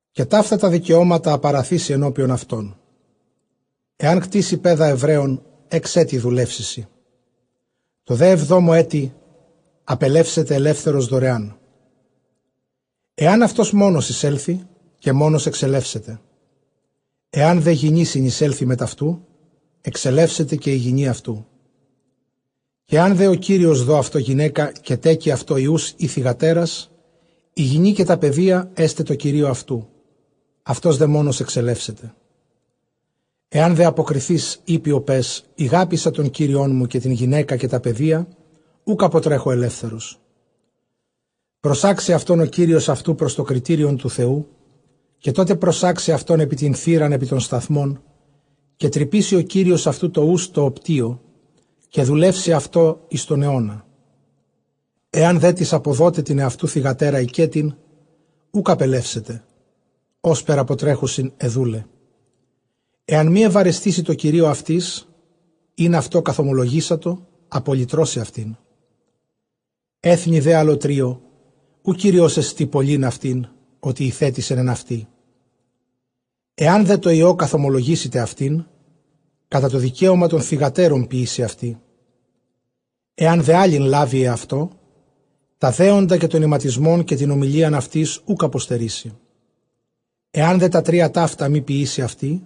Καὶ ταῦτα τὰ δικαιώματα, ἃ παραθήσῃ ἐνώπιον αὐτῶν. Ἐὰν κτήσῃ παῖδα Ἐβραῖον, ἓξ ἔτη δουλεύσει σοι· τῷ δὲ ἑβδόμῳ ἔτει ἀπελεύσεται ἐλεύθερος δωρεάν. Ἐὰν αὐτὸς μόνος εἰσέλθῃ, καὶ μόνος ἐξελεύσεται· ἐὰν δὲ γυνὴ συνεισέλθῃ μετʼ αὐτοῦ, ἐξελεύσεται καὶ ἡ γυνὴ αὐτοῦ. Καὶ ἐὰν δὲ ὁ κύριος δῷ αὐτῷ γυναῖκα, καὶ τέκῃ αὐτῷ υἱοὺς ἢ θυγατέρας, ἡ γυνὴ καὶ τὰ παιδία ἔσται τῷ κυρίῳ αὐτοῦ, αὐτὸς δὲ μόνος ἐξελεύσεται. Ἐὰν δὲ ἀποκριθεὶς εἴπῃ ὁ παῖς, ἠγάπηκα τὸν κύριόν μου, καὶ τὴν γυναῖκα, καὶ τὰ παιδία, οὐκ ἀποτρέχω ἐλεύθερος· προσάξει αὐτὸν ὁ κύριος αὐτοῦ πρὸς τὸ κριτήριον τοῦ Θεοῦ, καὶ τότε προσάξει αὐτὸν ἐπὶ τὴν θύραν ἐπὶ τὸν σταθμὸν, καὶ τρυπήσει ὁ κύριος αὐτοῦ τὸ οὖς τῷ ὀπητίῳ, καὶ δουλεύσει αὐτῷ εἰς τὸν αἰῶνα. Ἐὰν δέ τις ἀποδῶται τὴν ἑαυτοῦ θυγατέρα οἰκέτιν, οὐκ ἀπελεύσεται, ὥσπερ ἀποτρέχουσιν αἱ δοῦλαι. Ἐὰν μὴ εὐαρεστήσῃ τῷ κυρίῳ αὐτῆς, ἣ αὐτῷ καθωμολογήσατο, ἀπολυτρώσει αὐτήν· ἔθνει δὲ ἀλλοτρίῳ οὐ κύριός ἐστι πωλεῖν αὐτὴν, ὅτι ἠθέτησεν ἐν αὐτῇ. Ἐὰν δὲ τῷ υἱῷ καθομολογήσηται αὐτὴν, κατὰ τὸ δικαίωμα τῶν θυγατέρων ποιήσει αὐτῇ. Ἐὰν δὲ ἄλλην λάβῃ ἑαυτῷ, τὰ δέοντα καὶ τὸν ἱματισμὸν καὶ τὴν ὁμιλίαν αὐτῆς οὐκ ἀποστερήσει. Ἐὰν δὲ τὰ τρία ταῦτα μὴ ποιήσῃ αὐτῇ,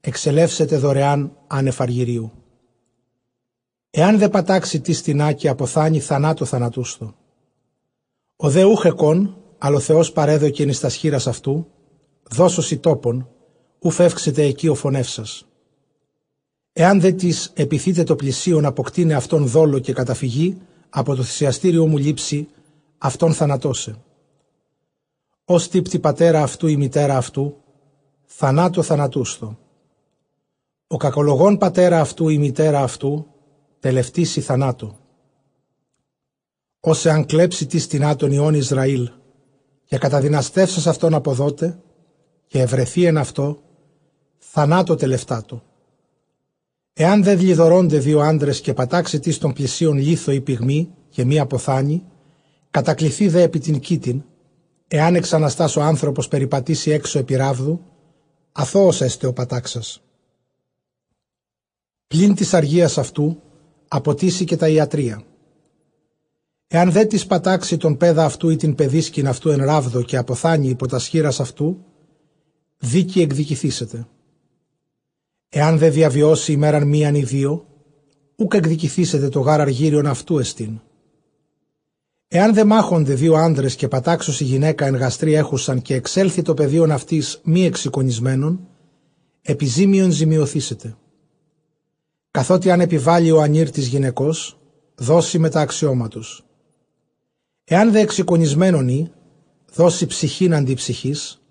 ἐξελεύσεται δωρεὰν ἄνευ ἀργυρίου. Ἐὰν δὲ πατάξῃ τις τινὰ, καὶ ἀποθάνῃ, θανάτῳ θανατούσθω. Ὁ δὲ οὐχ ἑκὼν, ἀλλὰ ὁ Θεὸς παρέδωκεν εἰς τὰς χεῖρας αὐτοῦ, δώσω σοι τόπον οὗ φεύξεται ἐκεῖ ὁ φονεύσας. Ἐὰν δέ τις ἐπιθῆται τῷ πλησίον ἀποκτεῖναι αὐτὸν δόλῳ, καὶ καταφύγῃ, ἀπὸ τοῦ θυσιαστηρίου μου λήψῃ αὐτὸν θανατῶσαι. Ὃς τύπτει πατέρα αὐτοῦ ἢ μητέρα αὐτοῦ, θανάτῳ θανατούσθω. Ὁ κακολογῶν πατέρα αὐτοῦ ἢ μητέρα αὐτοῦ, τελευτήσει θανάτῳ. Ὃς ἐὰν κλέψῃ τις τινὰ τῶν υἱῶν Ἰσραὴλ, καὶ καταδυναστεύσας αὐτὸν ἀποδῶται, καὶ εὑρεθῇ ἐν αὐτῷ, θανάτῳ τελευτάτω. Ἐὰν δὲ λοιδορῶνται δύο ἄνδρες, καὶ πατάξωσι τὸν πλησίον λίθῳ ἢ πυγμῇ, καὶ μὴ ἀποθάνῃ, κατακλιθῇ δὲ ἐπὶ τὴν κοίτην, ἐὰν ἐξαναστὰς ὁ ἄνθρωπος περιπατήσῃ ἔξω ἐπὶ ῥάβδου, ἀθῶος ἔσται ὁ πατάξας· πλὴν τῆς ἀργείας αὐτοῦ ἀποτίσει, καὶ τὰ ἰατρεῖα. Ἐὰν δέ τις πατάξῃ τὸν παῖδα αὐτοῦ ἢ τὴν παιδίσκην αὐτοῦ ἐν ῥάβδῳ, καὶ ἀποθάνῃ ὑπὸ τὰς χεῖρας αὐτοῦ, δίκῃ ἐκδικηθήσεται. Ἐὰν δὲ διαβιώσῃ ἡμέραν μίαν ἢ δύο, οὐκ ἐκδικηθήτω· τὸ γὰρ ἀργύριον αὐτοῦ ἐστιν. Ἐὰν δὲ μάχωνται δύο ἄνδρες, καὶ πατάξωσι γυναῖκα ἐν γαστρὶ ἔχουσαν, καὶ ἐξέλθῃ τὸ παιδίον αὐτῆς μὴ ἐξεικονισμένον, ἐπιζήμιον ζημιωθήσεται· καθότι ἂν ἐπιβάλῃ ὁ ἀνὴρ τῆς γυναικὸς, δώσει μετὰ ἀξιώματος. Ἐὰν δὲ ἐξεικονισμένον ᾖ, δώσει ψυχὴν ἀντὶ ψυχῆς,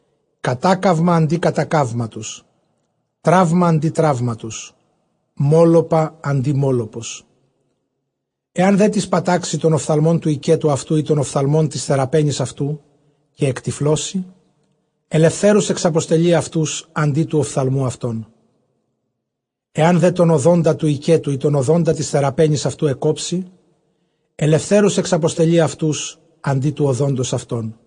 κατάκαυμα ἀντὶ κατακαύματος, τραῦμα ἀντὶ τραύματος, μώλωπα ἀντὶ μώλωπος. Ἐὰν δέ τις πατάξῃ τὸν ὀφθαλμὸν τοῦ οἰκέτου αὐτοῦ, ἢ τὸν ὀφθαλμὸν τῆς θεραπαίνης αὐτοῦ, καὶ ἐκτυφλώσῃ, ἐλευθέρους ἐξαποστελεῖ αὐτοὺς ἀντὶ τοῦ ὀφθαλμοῦ αὐτῶν. Ἐὰν δὲ τὸν ὀδόντα τοῦ οἰκέτου, ἢ τὸν ὀδόντα τῆς θεραπαίνης αὐτοῦ ἐκκόψῃ, ἐλευθέρους ἐξαποστελεῖ αὐτοὺς ἀντὶ τοῦ ὀδόντος αὐτῶν.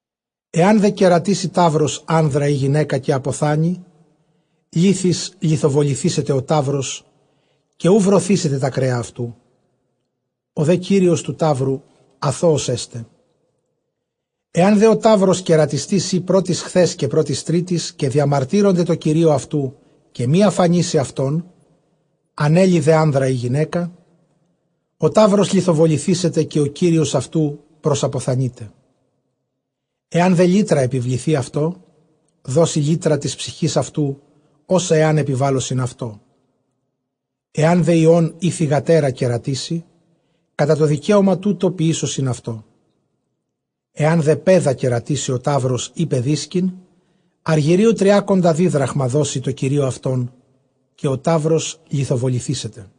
Ἐὰν δὲ κερατίσῃ ταῦρος ἄνδρα ἢ γυναῖκα καὶ ἀποθάνῃ, λίθοις λιθοβοληθήσεται ὁ ταῦρος, καὶ οὐ βρωθήσεται τὰ κρέα αὐτοῦ· ὁ δὲ κύριος τοῦ ταύρου ἀθῶος ἔσται. Ἐὰν δὲ ὁ ταῦρος κερατιστὴς ᾖ πρὸ τῆς χθὲς καὶ πρὸ τῆς τρίτης, καὶ διαμαρτύρωνται τῷ κυρίῳ αὐτοῦ, καὶ μὴ ἀφανίσῃ αὐτὸν, ἀνέλῃ δὲ ἄνδρα ἢ γυναῖκα, ὁ ταῦρος λιθοβοληθήσεται, καὶ ὁ κύριος αὐτοῦ προσαποθανεῖται. Ἐὰν δὲ λύτρα ἐπιβληθῇ αὐτῷ, δώσει λύτρα τῆς ψυχῆς αὐτοῦ ὅσα ἐὰν ἐπιβάλωσιν αὐτῶ. Ἐὰν δὲ υἱὸν ἢ θυγατέρα κερατίσῃ, κατὰ τὸ δικαίωμα τοῦτο ποιήσωσιν αὐτῷ. Ἐὰν δὲ παῖδα κερατίσῃ ὁ ταῦρος ἢ παιδίσκην, ἀργυρίου τριάκοντα δίδραχμα δώσει τῷ κυρίῳ αὐτῶν, καὶ ὁ ταῦρος λιθοβοληθήσεται.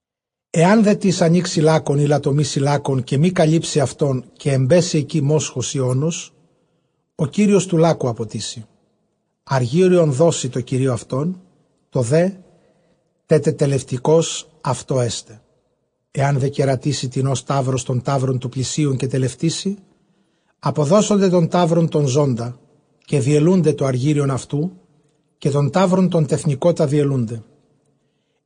Ἐὰν δέ τις ἀνοίξῃ λάκκον ἢ λατομήσῃ λάκκον, καὶ μὴ καλύψῃ αὐτὸν, καὶ ἐμπέσῃ ἐκεῖ μόσχος ἢ ὄνος, ὁ κύριος τοῦ λάκκου ἀποτίσει, ἀργύριον δώσει τῷ κυρίῳ αὐτῶν· τὸ δὲ τετελευτηκὸς αὐτῷ ἔσται. Ἐὰν δὲ κερατίσῃ τινὸς ταῦρος τόν ταῦρον τοῦ πλησίον, καὶ τελευτήσῃ, ἀποδώσονται τὸν ταῦρον τὸν ζῶντα, καὶ διελοῦνται τὸ ἀργύριον αὐτοῦ, καὶ τὸν ταῦρον τὸν τεθνηκότα διελοῦνται.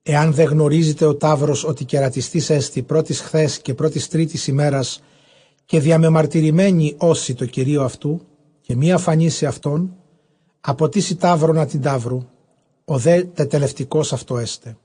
Ἐὰν δὲ γνωρίζηται ὁ ταῦρος ὅτι κερατιστής ἐστι πρὸ τῆς χθὲς καὶ πρὸ τῆς τρίτης ἡμέρας, καὶ διαμεμαρτυρημένοι ὦσι τῷ κυρίῳ αὐτοῦ· καὶ μὴ ἀφανίσῃ αὐτὸν, ἀποτίσει ταῦρον ἀντὶ ταύρου, ὁ δὲ τετελευτηκὼς αὐτῷ ἔσται.